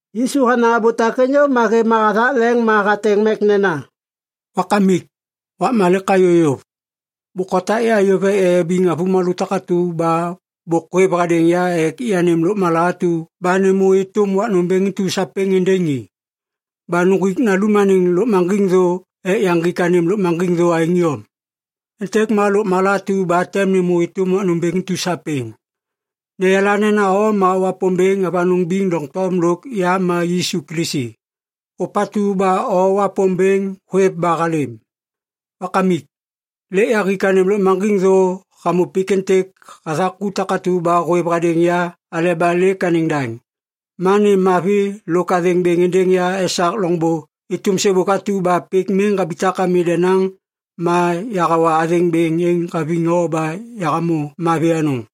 Yisu hanaŋ abô takêŋ yôv ma hêv ma hathak leŋ ma hateŋ mek nena, “Wakamik, wakma lêk hayô yôv. Bôk hotak ya yôv ek yayabiŋ avômalô takatu ba bôk hôêv hadêŋ ya ek yanêm lôkmala atu ba nêmô êtôm wak nômbêŋ intu sapêŋ êndêŋ i. Ba nuŋgwik Nalum anêŋ lôkmaŋgiŋ thô ek yaŋgik anêm lôkmaŋgiŋ thô aêŋ iyom. Êntêk ma lôkmala atu ba tem nêmô êtôm wak nômbêŋ intu sapêŋ. Neyala nena O ma Wapômbêŋ avanôŋ biŋ doŋtom lôk ya ma Yisu Kilisi, ôpatu ba O Wapômbêŋ hôêv ba halêm. Wakamik, lêk yahik anêm lôkmaŋgiŋ thô hamô pik êntêk hathak ku takatu ba hôêv hadêŋ ya aleba lêk anêŋ daŋ. Ma nêm mavi lôk athêŋ bêŋ êndêŋ ya esak loŋbô êtôm sêbôk atu ba pik miŋ habitak ami denaŋ ma yahawa athêŋ bêŋ êŋ haviŋ o ba yahamô mavi anôŋ.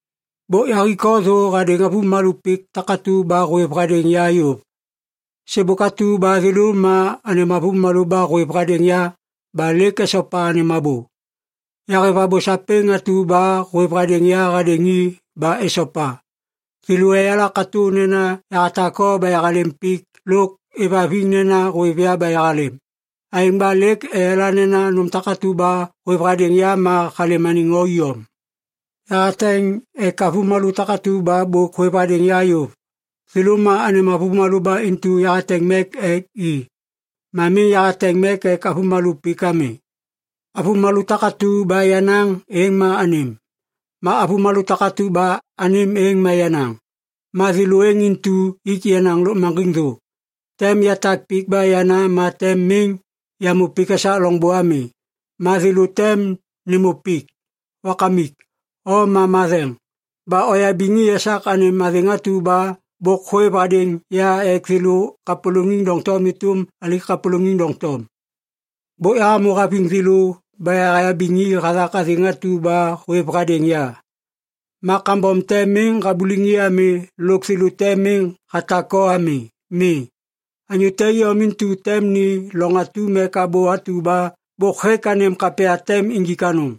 “Bôk yahik o thô hadêŋ avômalô pik takatu ba hôêv hadêŋ ya yôv. Sêbôk atu ba thêlô ma anêm avômalô ba hôêv hadêŋ ya ba lêk esopa anêm abô. Yahêv abô sapêŋ atu ba hôêv hadêŋ ya hadêŋ i ba esopa. Thêlô eyala katô nena yahatak o ba yahalêm pik lôk êvhaviŋ nena hôêv ya ba yahalêm. Aêŋ ba lêk eyala nena nôm takatu ba hôêv hadêŋ ya ma halêm anêŋ o iyom. Yahateŋ ek avômalô takatu ba bôk hôêv hadêŋ ya yôv. Thêlô ma anêm avômalô ba intu yahateŋ mek ek i. Ma miŋ yahateŋ mek ek avômalô pik ami. Avômalô takatu ba yenaŋ êŋ ma anêm. Ma avômalô takatu ba anêm êŋ ma yenaŋ. Ma thêlô êŋ intu ik yenaŋ lôkmaŋgiŋ thô. Tem yatak pik ba yana ma tem miŋ yamô pik esak loŋbô ami. Ma thêlô tem nêmô pik. Wakamik, o ma matheŋ! Ba oyabiŋ i esak anêm athêŋ atu ba bôk hôêv hadêŋ ya ek thêlô kapôlôŋiŋ doŋtom êtôm alai kapôlôŋiŋ doŋtom. Bôk yahamô haviŋ thêlô ba yahayabiŋ i hathak athêŋ atu ba hôêv hadêŋ ya. Ma kambom te miŋ habuliŋ i ami lôk thêlô te miŋ hatak o ami. Mi. Anyô te iyom intu tem ni loŋ atum ek abô atu ba bôk hêk anêm kapya tem injik anôŋ.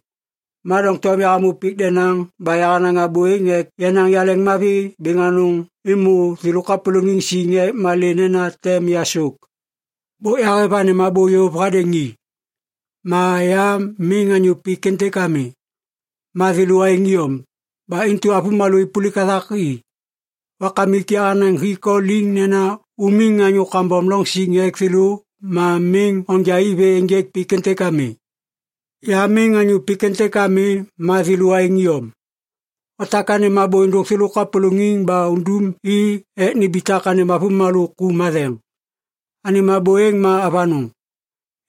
“Ma doŋtom yahamô pik denaŋ ba yahanaŋ abô êŋ ek yenaŋ yaleŋmavi bêŋ anôŋ êmô thêlô kapôlôŋiŋ siŋ ek malê nena tem yasôk. Bôk yahêv anêm abô yôv hadêŋ i. Ma ya miŋ anyô pik êntêk ami. Ma thêlô aêŋ iyom. Ba intu avômalô êpôlik hathak i. Wakamik yahanaŋ hik o liŋ nena umiŋ anyô kambom loŋ siŋ ek thêlô ma miŋ onja i vê ênjêk pik êntêk ami. Ya miŋ anyô pik êntêk ami ma thêlô aêŋ iyom. Otak anêm abô êndôk thêlô kapôlôŋiŋ ba undum i ek nimbitak anêm avômalô ku matheŋ. Anêm abô êŋ ma avanôŋ.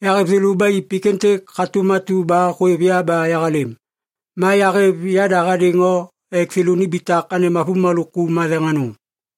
Yahêv thêlô ba i pik êntêk hatôm atu ba hôêv ya ba yahalêm. Ma yahêv yada hadêŋ o ek thêlô nimbitak anêm avômalô ku matheŋ anôŋ.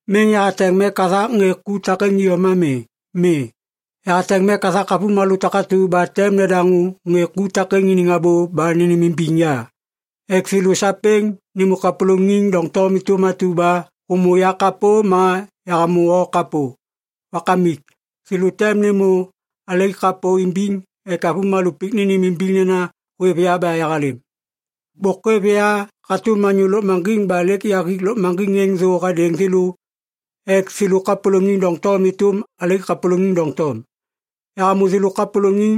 “Miŋ yahateŋ mek hathak ŋê ku takêŋ iyom ami. Mi. Yahateŋ mek hathak avômalô takatu ba tem nedaŋô ŋê ku takêŋ iniŋ abô ba nênêmimbiŋ ya ek thêlô sapêŋ nêmô kapôlôŋiŋ doŋtom êtôm atu ba hômô yakapô ma yahamô o kapô. Wakamik, thêlô tem nêmô alai kapô imbiŋ ek avômalô pik nênêmimbiŋ nena hôêv ya ba yahalêm. Bôk hôêv ya hatôm anyô lôkmaŋgiŋ ba lêk yahik lôkmaŋgiŋ êŋ thô hadêŋ thêlô ek thêlô kapôlôŋiŋ doŋtom êtôm alai kapôlôŋiŋ doŋtom. Yahamô thêlô kapôlôŋiŋ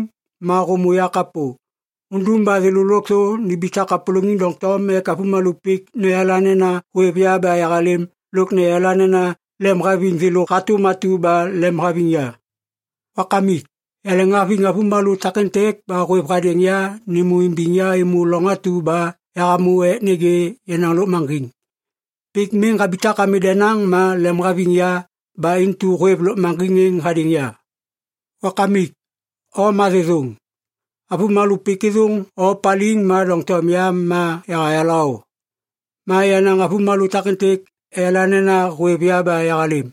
ma hômô ya kapô. Undum ba thêlô lôkthô nimbitak kapôlôŋiŋ doŋtom ek avômalô pik neyala nena hôêv ya ba yahalêm lôk neyala nena lemhaviŋ thêlô hatôm atu ba lemhaviŋ ya. “Wakamik, yaleŋhaviŋ avômalô takêntêk ba hôêv hadêŋ ya nêmô imbiŋ ya êmô loŋ atu ba yahamô ek nêgê yenaŋ lôkmaŋgiŋ. Pik miŋ habitak ami denaŋ ma lemhaviŋ ya ba intu hôêv lôkmaŋgiŋ êŋ hadêŋ ya. “Wakamik, o ma thêthôŋ. Avômalô pik êthôŋ o paliŋ ma doŋtom ya ma yahayala o. Ma yenaŋ avômalô takêntêk eyala nena hôêv ya ba yahalêm.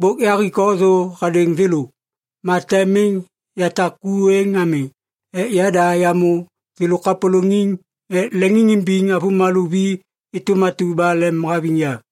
Bôk yahik o thô hadêŋ thêlô. Ma tem miŋ yatak ku êŋ ami ek yada yamô thêlô kapôlôŋiŋ ek leŋiŋimbiŋ avômalô vi êtôm atu ba lemhaviŋ ya.”